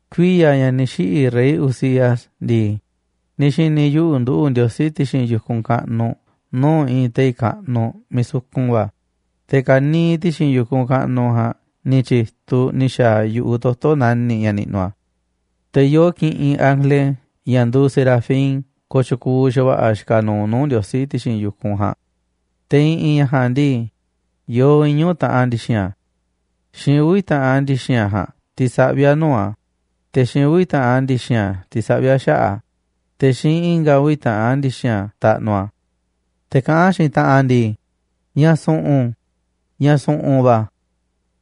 Kuiya̱ ña̱ ni̱ xiꞌi̱ rey Uzías ndii, ni̱ xi̱ni̱ yuꞌu̱ nduꞌu̱ Ndiosí ti̱xi̱n yu̱kunꞌ kaꞌnuꞌ nuu̱ꞌ i̱i̱n tei̱ kaꞌnuꞌ miiꞌ sukun va̱, te̱ ka̱niiꞌ ti̱xi̱n yu̱kunꞌ kaꞌnuꞌ ja̱a̱nꞌ ni̱ tyi̱tuꞌ ni̱ xa̱a̱ yu̱ꞌuꞌ toto̱ nani̱ꞌ ña̱ niꞌnuꞌ a̱. Te̱ yoo kiꞌinꞌ ángele ña̱ nduuꞌ serafín kooꞌ tyukuuꞌ xa̱va̱ꞌa̱ xikaꞌ nuuꞌ nuu̱ꞌ Ndiosí ti̱xi̱n yu̱kunꞌ ja̱a̱nꞌ. Te̱ i̱ꞌi̱n ña̱ ja̱a̱nꞌ ndii, yoo iñu̱ taꞌan ndi̱xi̱n a̱. Xiinꞌ uvi̱ taꞌan ndi̱xi̱n a̱ ja̱a̱nꞌ tisaꞌví a̱ nuu̱ꞌ a̱, te̱ xiinꞌ uvi̱ taꞌan ndi̱xi̱n a̱ tisaꞌví a̱ xaꞌa̱ꞌ a̱, te̱ xiinꞌ i̱nga̱ uvi̱ taꞌan ndi̱xi̱n a̱ taꞌnuꞌ a̱. Te̱ kaꞌán xiinꞌ taꞌanꞌ a̱ ndii: “Ña̱ su̱ꞌu̱n, ña̱ su̱ꞌu̱n va̱,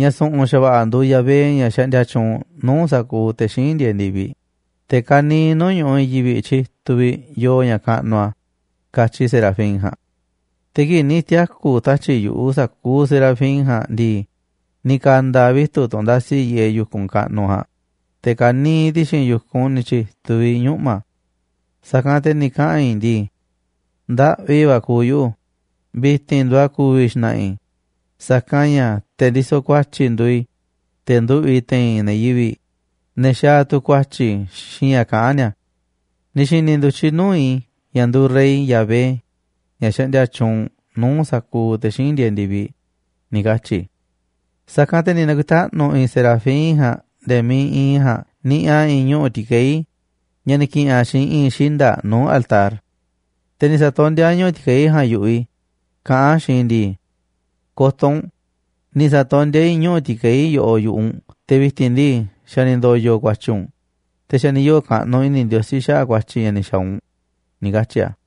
ña̱ su̱ꞌu̱n xa̱va̱ꞌa̱ nduuꞌ Yahvé, ña̱ xaꞌndia tyuunꞌ nuu̱ꞌ sa̱kuuꞌ te̱ xíinꞌ ndieeꞌ ndi̱viꞌ, te̱ ka̱niiꞌ nuu̱ꞌ ñu̱ꞌuꞌ i̱i̱n yivi̱ꞌ tyituꞌ vi̱ꞌ yoo ña̱ kaꞌnuꞌ a̱”, katyi serafín ja̱a̱nꞌ. Te̱ kii̱ꞌ ni̱ tiaku̱ tatyi̱ꞌ yu̱ꞌuꞌ sa̱kuuꞌ serafín ja̱a̱nꞌ ndii, ni̱ ka̱nda̱ vitu̱ꞌ tunꞌ ndasi yiꞌeꞌ yu̱kunꞌ kaꞌnuꞌ ja̱a̱nꞌ, te̱ ka̱niiꞌ ti̱xi̱n yu̱kunꞌ ni̱ tyi̱tuꞌ vi̱ꞌ ñuꞌma̱. Sa̱kanꞌ te̱ ni̱ kaꞌa̱n i̱ ndii: “Ndaꞌvi va̱ kuuꞌ yuꞌu̱, vi̱ti̱n nduuꞌ a̱ ku̱vi̱ xna̱ꞌa̱ i̱, sa̱kanꞌ ña̱ te̱ ndisoꞌ ku̱a̱tyi̱ nduuꞌ i̱, te̱ nduꞌu̱ꞌ i̱ te̱i̱n ne̱ yivi̱ꞌ, ne̱ xaaꞌ tu̱ ku̱a̱tyi̱ xiinꞌ ña̱ kaꞌán ni̱a̱. Ni̱ xi̱ni̱ ndu̱tyiꞌ nuu̱ꞌ i̱ ña̱ nduuꞌ Rey, Yahvé, ña̱ xaꞌndia tyuunꞌ nuu̱ꞌ sa̱kuuꞌ te̱ xíinꞌ ndieeꞌ ndi̱viꞌ”, ni̱ katyi̱ i̱. Sa̱kanꞌ te̱ ni̱ na̱ku̱i̱taꞌnu̱ i̱i̱n serafín ja̱a̱nꞌ nde̱e̱ miiꞌ iinꞌ i̱ ja̱a̱nꞌ niꞌiꞌ a̱ i̱i̱n ñuꞌu̱ ti̱kei̱ ña̱ ni̱ ki̱ꞌi̱n a̱ xiinꞌ i̱i̱n xinda̱ꞌ nuu̱ꞌ altar. Te̱ ni̱ sa̱tondíá a̱ ñuꞌu̱ ti̱kei̱ ja̱a̱nꞌ yu̱ꞌuꞌ i̱, kaꞌán a̱ xiinꞌ i̱ ndii: “Ko̱to̱ u̱nꞌ, ni̱ sa̱tondíá i̱ ñuꞌu̱ ti̱kei̱ yoꞌoꞌ yu̱ꞌuꞌ u̱nꞌ, te̱ vi̱ti̱n ndii, xa̱ ni̱ ndo̱yo̱ ku̱a̱tyi̱ u̱nꞌ, te̱ xa̱ ni̱ yoo̱ kaꞌnuꞌ i̱ni̱ Ndiosí xaꞌa̱ꞌ kua̱tyi̱ ña̱ ni̱ xa̱a̱ u̱nꞌ”, ni̱ katyi̱ a̱.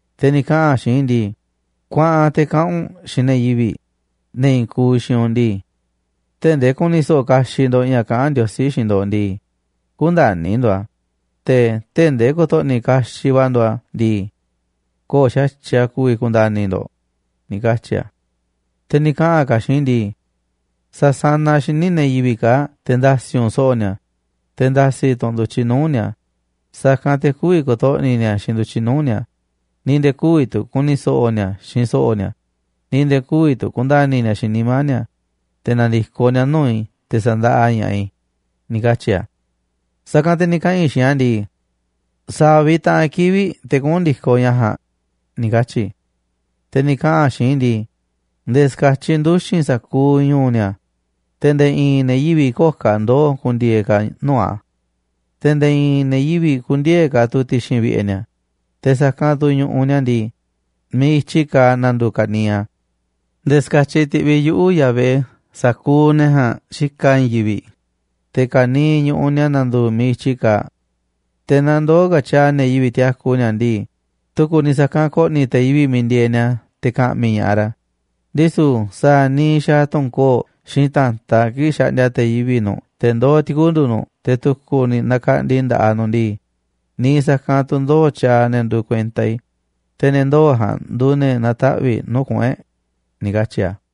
Te̱ ni̱ kaꞌa̱n a̱ xiinꞌ i̱ ndii: “Kuaꞌan te̱ kaꞌa̱n u̱nꞌ xiinꞌ ne̱ yivi̱ꞌ, ne̱ i̱i̱n kuuꞌ xiinꞌ u̱nꞌ ndii: Tee̱ꞌ ndee ku̱ni̱ so̱ꞌo̱ kaxiꞌ ndo̱ꞌ ña̱ kaꞌán Ndiosí xiinꞌ ndo̱ꞌ ndii, kü̱nda̱ni̱ ndo̱ꞌ a̱, te̱ tee̱ꞌ ndee ko̱to̱ꞌni̱ kaxiꞌ va̱ ndo̱ꞌ a̱ ndii, köo̱ꞌ xa̱tyiꞌ a̱ ku̱vi̱ ku̱nda̱ni̱ ndo̱ꞌ”, ni̱ katyi̱ a̱. Te̱ ni̱ kaꞌa̱n ka̱ a̱ xiinꞌ i̱ ndii: “Sa̱sanaꞌ xíniꞌ ne̱ yivi̱ꞌ kaa̱ꞌ te̱ nda̱si̱ u̱nꞌ so̱ꞌo̱ ni̱a̱, te̱ nda̱si̱ tu̱ u̱nꞌ ndu̱tyiꞌ nuu̱ꞌ ni̱a̱, sa̱kanꞌ te̱ kü̱vi̱ ko̱to̱ꞌni̱ ni̱a̱ xiinꞌ ndu̱tyiꞌ nuu̱ꞌ ni̱a̱, ni̱ nde̱e̱ kü̱vi̱ tu̱ ku̱ni̱ so̱ꞌo̱ ni̱a̱ xiinꞌ so̱ꞌo̱ ni̱a̱, ni̱ nde̱e̱ kü̱vi̱ tu̱ ku̱nda̱ni̱ ni̱a̱ xiinꞌ nimá ni̱a̱, te̱ na̱ndi̱koꞌ ni̱a̱ nuu̱ꞌ i̱ te̱ sa̱ndaꞌa ña̱ꞌaꞌ i̱”, ni̱ katyi̱ a̱. Sa̱kanꞌ te̱ ni̱ kaꞌa̱n i̱ xiinꞌ a̱ ndii: “¿Sa̱a̱ vi̱ꞌ taꞌan kivi̱ꞌ te̱ kuꞌu̱n ndi̱koꞌ ña̱ ja̱a̱nꞌ?”, ni̱ katyi̱ i̱. Te̱ ni̱ kaꞌa̱n a̱ xiinꞌ i̱ ndii: “Nde̱e̱ ska̱tyiꞌ nduxi̱n sa̱kuuꞌ ñu̱u̱ ni̱a̱, te̱ nde̱e̱ i̱i̱n ne̱ yivi̱ꞌ köo̱ꞌ ka̱ ndoo̱ ku̱ndi̱e̱e̱ ka̱ nuu̱ꞌ a̱, te̱ nde̱e̱ i̱i̱n ne̱ yivi̱ꞌ kü̱ndi̱e̱e̱ ka̱ tu̱ ti̱xi̱n vi̱ꞌe̱ ni̱a̱, te̱ sa̱kanꞌ tu̱ ñu̱ꞌuꞌ ni̱a̱ ndii, miiꞌ i̱tyiꞌ kaaꞌ na̱ndu̱u̱ ka̱niiꞌ a̱. Nde̱e̱ ska̱tyiꞌ ti̱ꞌviꞌ yuꞌu̱, Yahvé, sa̱kuuꞌ ne̱ ja̱a̱nꞌ xikaꞌ i̱i̱n yivi̱ꞌ, te̱ ka̱niiꞌ ñu̱ꞌuꞌ ni̱a̱ na̱ndu̱u̱ miiꞌ i̱tyi kaaꞌ. Te̱ naaꞌ ndoo̱ ka̱ tyaaꞌ ne̱ yivi̱ꞌ tiaku ni̱a̱ ndii, tu̱ku̱ ni̱ sa̱kanꞌ ko̱ꞌni̱ te̱ yivi̱ꞌ miiꞌ ndieeꞌ ni̱a̱ te̱ ka̱ꞌmi̱ ña̱ꞌaꞌ ra̱. Ndisu̱ sa̱a̱ niiꞌ xaaꞌ tu̱n koo̱ꞌ xiinꞌ ta̱ntaꞌ kii̱ꞌ xaꞌndia te̱ yivi̱ꞌ nu̱ꞌ te̱ ndoó ti̱kundu̱ nu̱ꞌ te̱ tu̱ku̱ ni̱ nakaꞌndi nda̱ꞌaꞌ nu̱ꞌ ndii, niiꞌ sa̱kanꞌ tu̱ ndoo̱ tyaaꞌ ne̱ nduuꞌ kuenta i̱, te̱ ne̱ ndoo̱ ja̱a̱nꞌ nduuꞌ ne̱ na̱taꞌvi̱ꞌ nuu̱ꞌ kuꞌu̱n e̱ꞌ”, ni̱ katyi̱ a̱.